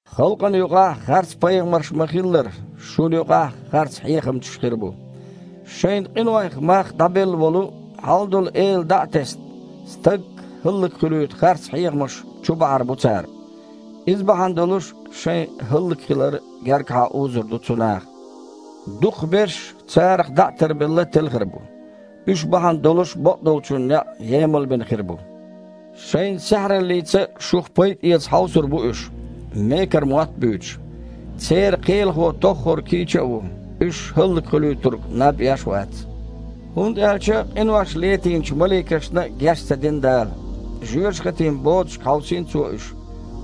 Халкъана юкъахь харцпайхамарш ма-хиллара, шуна юкъахь а харцхьехамчаш хир бу. Шайн къинойх мах дІабелла волу Хьалдолу Эла дІа а тесна, стаг хІаллакьхуьлуьйту харц хьехамаш чубахьар бу цара. Иза бахьана долуш шайн хІаллакьхилар гергахьа узур ду цу наха. Дукхахберш, царах дІа а тарбелла, телхар бу, уьш бахьана долуш бакъдолчун некъ емалбина хир бу. Шайн саьхьараллица шух пайда эца хьовсур бу уьш, мекара мотт а буьйцуш. Церан Кхелахо тоххара кийча а ву, уьш ХІаллакьхуьлуьйтург наб еш а вац. ХІунда аьлча къинош летийначу маликашна а геч ца дина Дала. Жоьжахатин бодашка хьовсийна Цо уьш,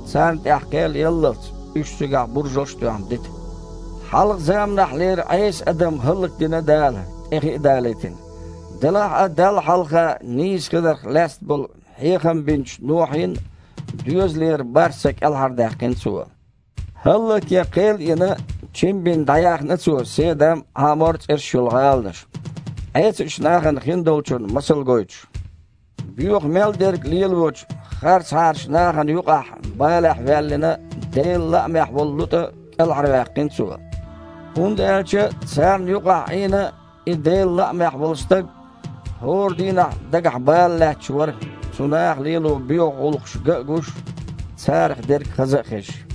царна тІехь кхел яллалц, уьш цигахь буржалш а тоьхна дита. Хьалха заманахьлера Іеса адам хІаллакдина Дала, тІе хи а далийтина. Делахь а Далла хьалха нийса хиларх лаьцна болу хьехам бинчу Нохьин доьзалера бархІ са кІелхьардаьккхина Цо. ХІаллакьян кхел а йина, чим бина дІаяьхна Цо Седам а, Іамор а цІераш йолу гІаланаш, Іесачу нахана хиндолчун масал гойтуш. Боьха мел дерг лелочу харцахьарчу нахана юкъахь балехь ваьллина Делан лаамехь волу ЛутІа кІелхьарваьккхина Цо. (ХІунда аьлча царна юкъахь Іийна и Делан лаамехь волу стаг хІора дийнахь дагахь бала лаьтташ вара, цу наха лело боьха гІуллакхаш ган а гуш, царах дерг хаза а хезаш.)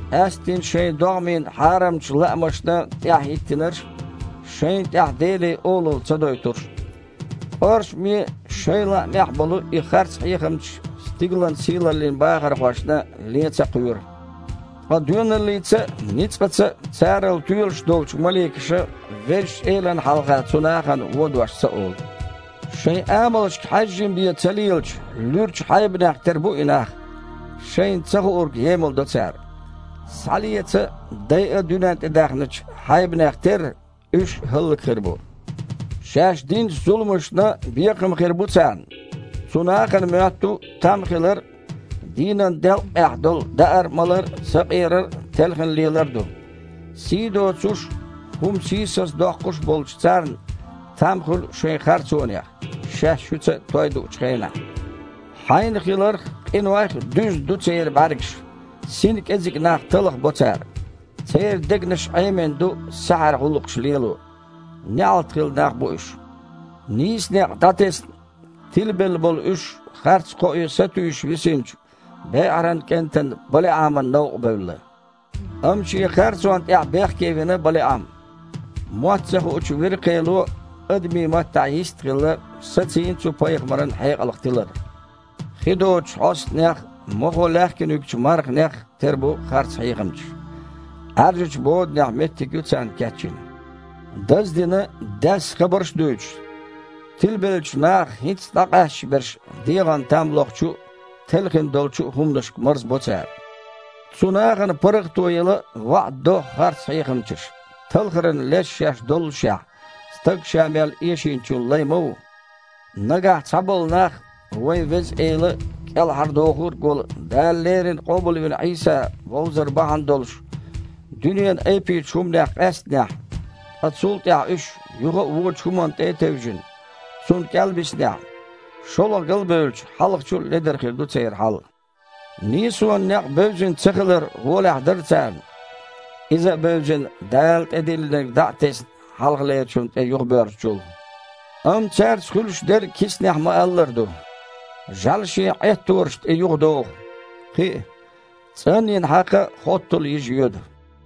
къаьсттина шайн догІмийн хьарамчу лаамашна тІаьхьахІиттинарш а, шайна тІехь Деле олалла ца дойтурш а. КІоршаме а, шайн лаамехь а болу и харцхьехамчаш стигалан сийлаллин бахархошна лен ца кхоьру. Ткъа доьналлица а, ницкъаца а царал тоьлуш долчу маликаша Везачу Элана хьалха цу нахана вон дош ца олу. Шайн амалшка хьаьжжина бен ца лелачу луьрачу хьайбанех тера бу и нах. Шайна ца хуург емалдо цара. Схьалеца а, дайа а дуьнен тІе даьхначу хьайбанех терра, уьш а хІаллакьхир бу. Шаьш динчу зуламашна бекхам хир бу царна. Цу нахана моьтту там хилар – дийнан делккъехь долу даар-малар а, сакъерар а, телхина лелар а ду. Сий доцуш а, хІума сийсаздоккхуш а болчу царна там хуьлу шайн харцонех, шаьш шуьца той дуучу хенахь. Хьайна хиларх а, къинойх а дуьзна ду церан бІаьргаш. Сина кІезиг нах талхабо цара. Церан дегнаш Іемина ду саьхьара гІуллакхаш лело. НеІалт хилла нах бу уьш. Нийса некъ дІатесна, тилабелла болу уьш, харц кхоэ сатуьйсуш висинчу БеІаран кІентан БалиІаман новкъа бевлла. Амма шен харцонна тІехь бехке вина БалиІам. Мотт ца хуучу виркхело, адамийн маттахь йист а хилла, сацийна цу пайхамаран хьекъалх тилар. Хи доцучу хьостанех а, мохо лаьхкина юьгучу марханех а тера бу харцхьехамчаш. Іаьржачу боданехь меттиг ю царна кечйина. Даздина, даьсса хабарш а дуьйцуш, тилабеллачу нахах хІинцца дІакъаьсташ берш дегІана там лохучу а, телхина долчу а хІуманашка марзбо цара. Цу нахана паргІато яла ваІда до харцхьехамчаша, талхаран леш шаьш доллушехь – стаг ша мел эшийначун лай ма ву. Нагахь цхьаболу нах вайн Веза Эла а, КІелхьардохург а волу Дала леррина къобалвина Іийса вовзар бахьана долуш дуьненан айпечу хІуманех къаьстинехь, ткъа цул тІаьхьа уьш, юха а вочу хІуманна тІе а тевжина, цунна кІел биснехь, шолгІа галбевлча, хьалхачул а ледара хир ду церан хьал. Нийсонан некъ бевзина цахилар гІолехь дара царна, иза а бевзина, Дала тІедиллинарг дІа а тесна, хьалхалерчунна тІе юхабоьрзучул. Амма цаьрца хуьлуш дерг кицанехь ма-аллара ду: «ЖІаьла шен Іеттораш тІе юхадогІу», кхин а: «ЦІанйина хьакха хоттала йижа йоьду».